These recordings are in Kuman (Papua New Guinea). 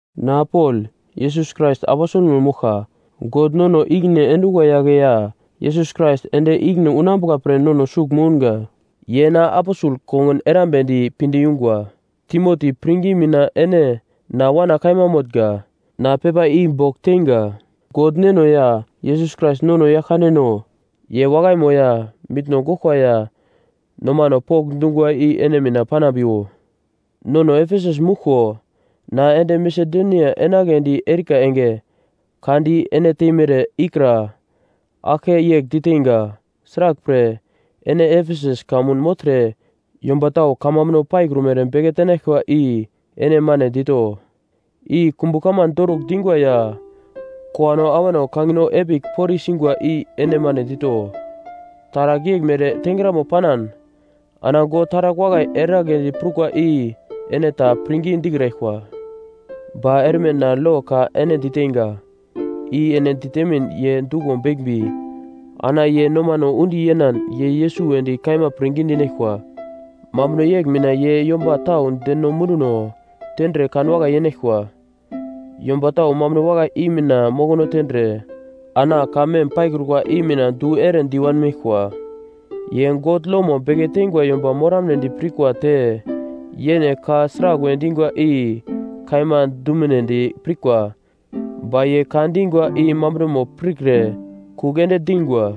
Na Pol Yesus Krais aposelmo moglka. God nono i-ikine endungwa yagle ya Yesus Krais ende ikine unambuka pre nono sugl mounga ye na aposel kongun erambedi pinde yungwa. Timoti, pirngi mina ene na wana kaima motnga. Na pepa i bogl teinga. God Neno ya Yesus Krais nono Yaglkandeno, ye wakaimo ya mitno goglkwa ya nomano pokndungwa i ene mina panambiwo. Nono Efesus mouglko na ende Masedonia enagledi erika enge ka di ene teimere ikra aglke yegl diteinga. Sraglpre ene Efesus kamun mogltre yomba tau kamambuno paikrumere beke tenaglkwa i ene mane dito. I kumbu kaman dorugl dingwa ya kowano awano kangino epigl poriye singwa i ene mane dito. Taragl yeglmere tengramo panan ana God taragl wakai eragledi prukwa i ene ta pirngi dikraglkwa. Ba erme na lo ka ene diteinga, i ene ditemin ye duglo beglmbi, ana ye nomano undi yenan ye Yesus wedi kaima pirngi dinaglkwa. Mambuno yegl mina ye yomba tau deno munduno tendre kan wakai yenaglkwa. Yomba tau mambuno wakai i mina mokono tendre ana ka mem paikrukwa i mina du ere di wanmeglkwa. Ye God lomo beke teingwa yomba moramnedi pirkwa te yene ka sraglwe dingwa i kaima dumunedi pirkwa ba ye ka dingwa i mambunomo pirkre kugl ende dingwa.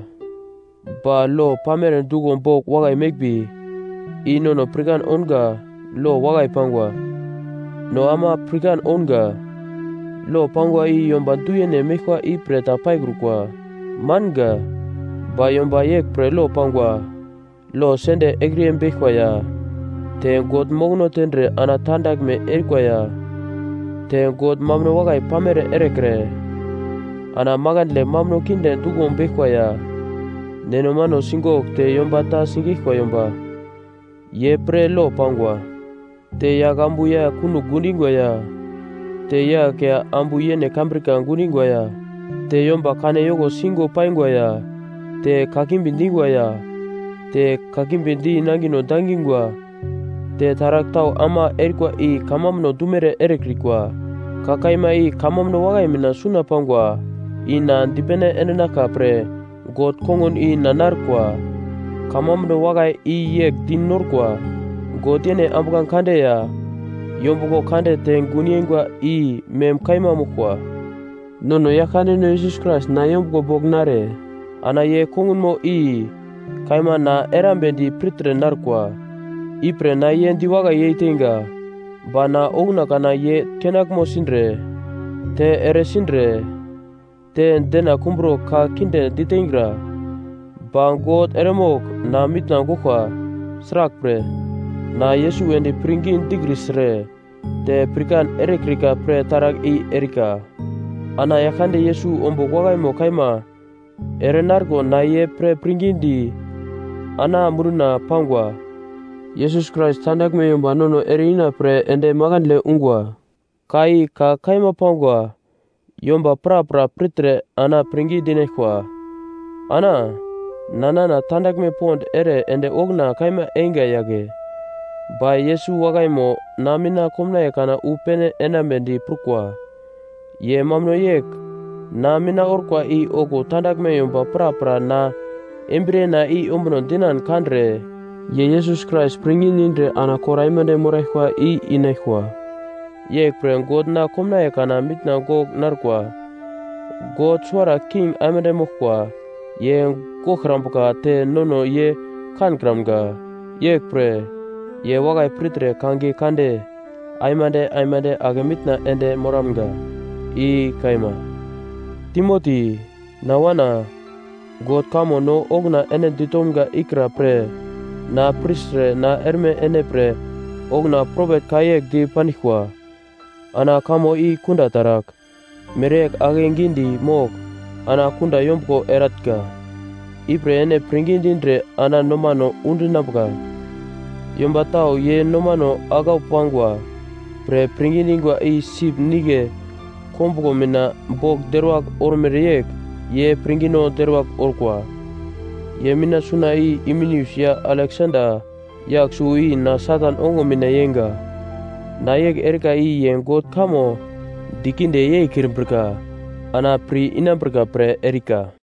Ba lo pamere duglo bogl wakai meglmbi, i nono pirkan ounga lo wakai pangwa. No ama pirkan ounga, lo pangwa i yomba du-yene meglkwa ipre ta paikrukwa. Manga. Ba yomba yeglpre lo pangwa: Lo sende ekriyebeglkwa ya, te God mokono tendre ana tandaglme erikwa ya, te God mambuno wakai pamere erekre, ana makandle mambuno kinde duglo beglkwa ya, neno mano sigogl te yomba ta sigeglkwa yomba, ye pre lo pangwa. Te yagl ambu ya kunogl gundingwa ya, te yagl ya ambu yene kambrika gundingwa ya te yomba kane yoko singo paingwa ya te kakimbi dingwa ya, te kakimbi di nangino dangingwa. Te taragl tau ama erikwa i kamambuno dumere erekrikwa. Ka kaima i kamambuno wakai mina suna pangwa, i na dipene endinaglka pre God kongun i na narkwa. Kamambuno wakai i yegl di norkwa, God yene ambuglange kande ya yombuglo kande te gun yeingwa i mem kaima moglkwa. Nono Yaglkandeno Yesus Krais na yombuglo bogl nare ana ye kongunmo i kaima na erambedi pirtre narkwa. Ipre na ye diwakai yei teinga. Ba na okuna kana ye kenaglmo sindre, te ere sindre, te dena kumbro ka kinde diteingra. Ba God eremogl na mitna goglkwa, sraglpre, na Yesus wedi pirngi dikrisre te pirkan erekrika pre taragl i erika. Ana Yaglkande Yesus ombugl wakaimo kaima ere narko na ye pre pirngidi ana munduna pangwa. Yesus Krais tandaglme yomba nono ere-ina pre ende makandle ungwa. Ka i ka kaima pangwa yomba prapra pirtre ana pirngi dinaglkwa. Ana na nana tandaglme pond ere ende okuna kaima einga yagle. Ba Yesus wakaimo na mina komnaiye kana wu pene enambedi prukwa. Ye mambuno yegl na mina orkwa i okuwo tandaglme yomba prapra na embriyena i ombuno dinan kandre ye Yesus Krais pirngi dindre ana kor aimande moraglkwa i inaglkwa. Yeglpre God na komnaiye kana mitna gogl narkwa. God suwara king aimande moglkwa, ye goglkrambuka te nono ye kankramga, yeglpre ye wakai pirtre kangiye kande aimande aimande ake mitna ende moramga. I kaima. Timoti, na wana, God kamo no okuna ene ditomga ikra pre na pirtre ana erme ene pre okuna propet ka yegl di pandiglkwa ana kamo i kunda taragl, mereyegl akegidi mogl ana kunda yombuglo eratnga. Ipre ene pirngi dindre ana nomano undinambuka, yomba tau ye nomano aglau pangwa pre pirngi dingwa i sip nigle kombuglo mina bogl deruwagl ormere yegl ye pirngino deruwagl orkwa. Ye mina suna i Himeneus ya Aleksanda yagl suwo i na Satan ongo mina yeinga. Na yegl erika i ye God kamo dikinde yeikrimbrika ana pir inambrika pre erika.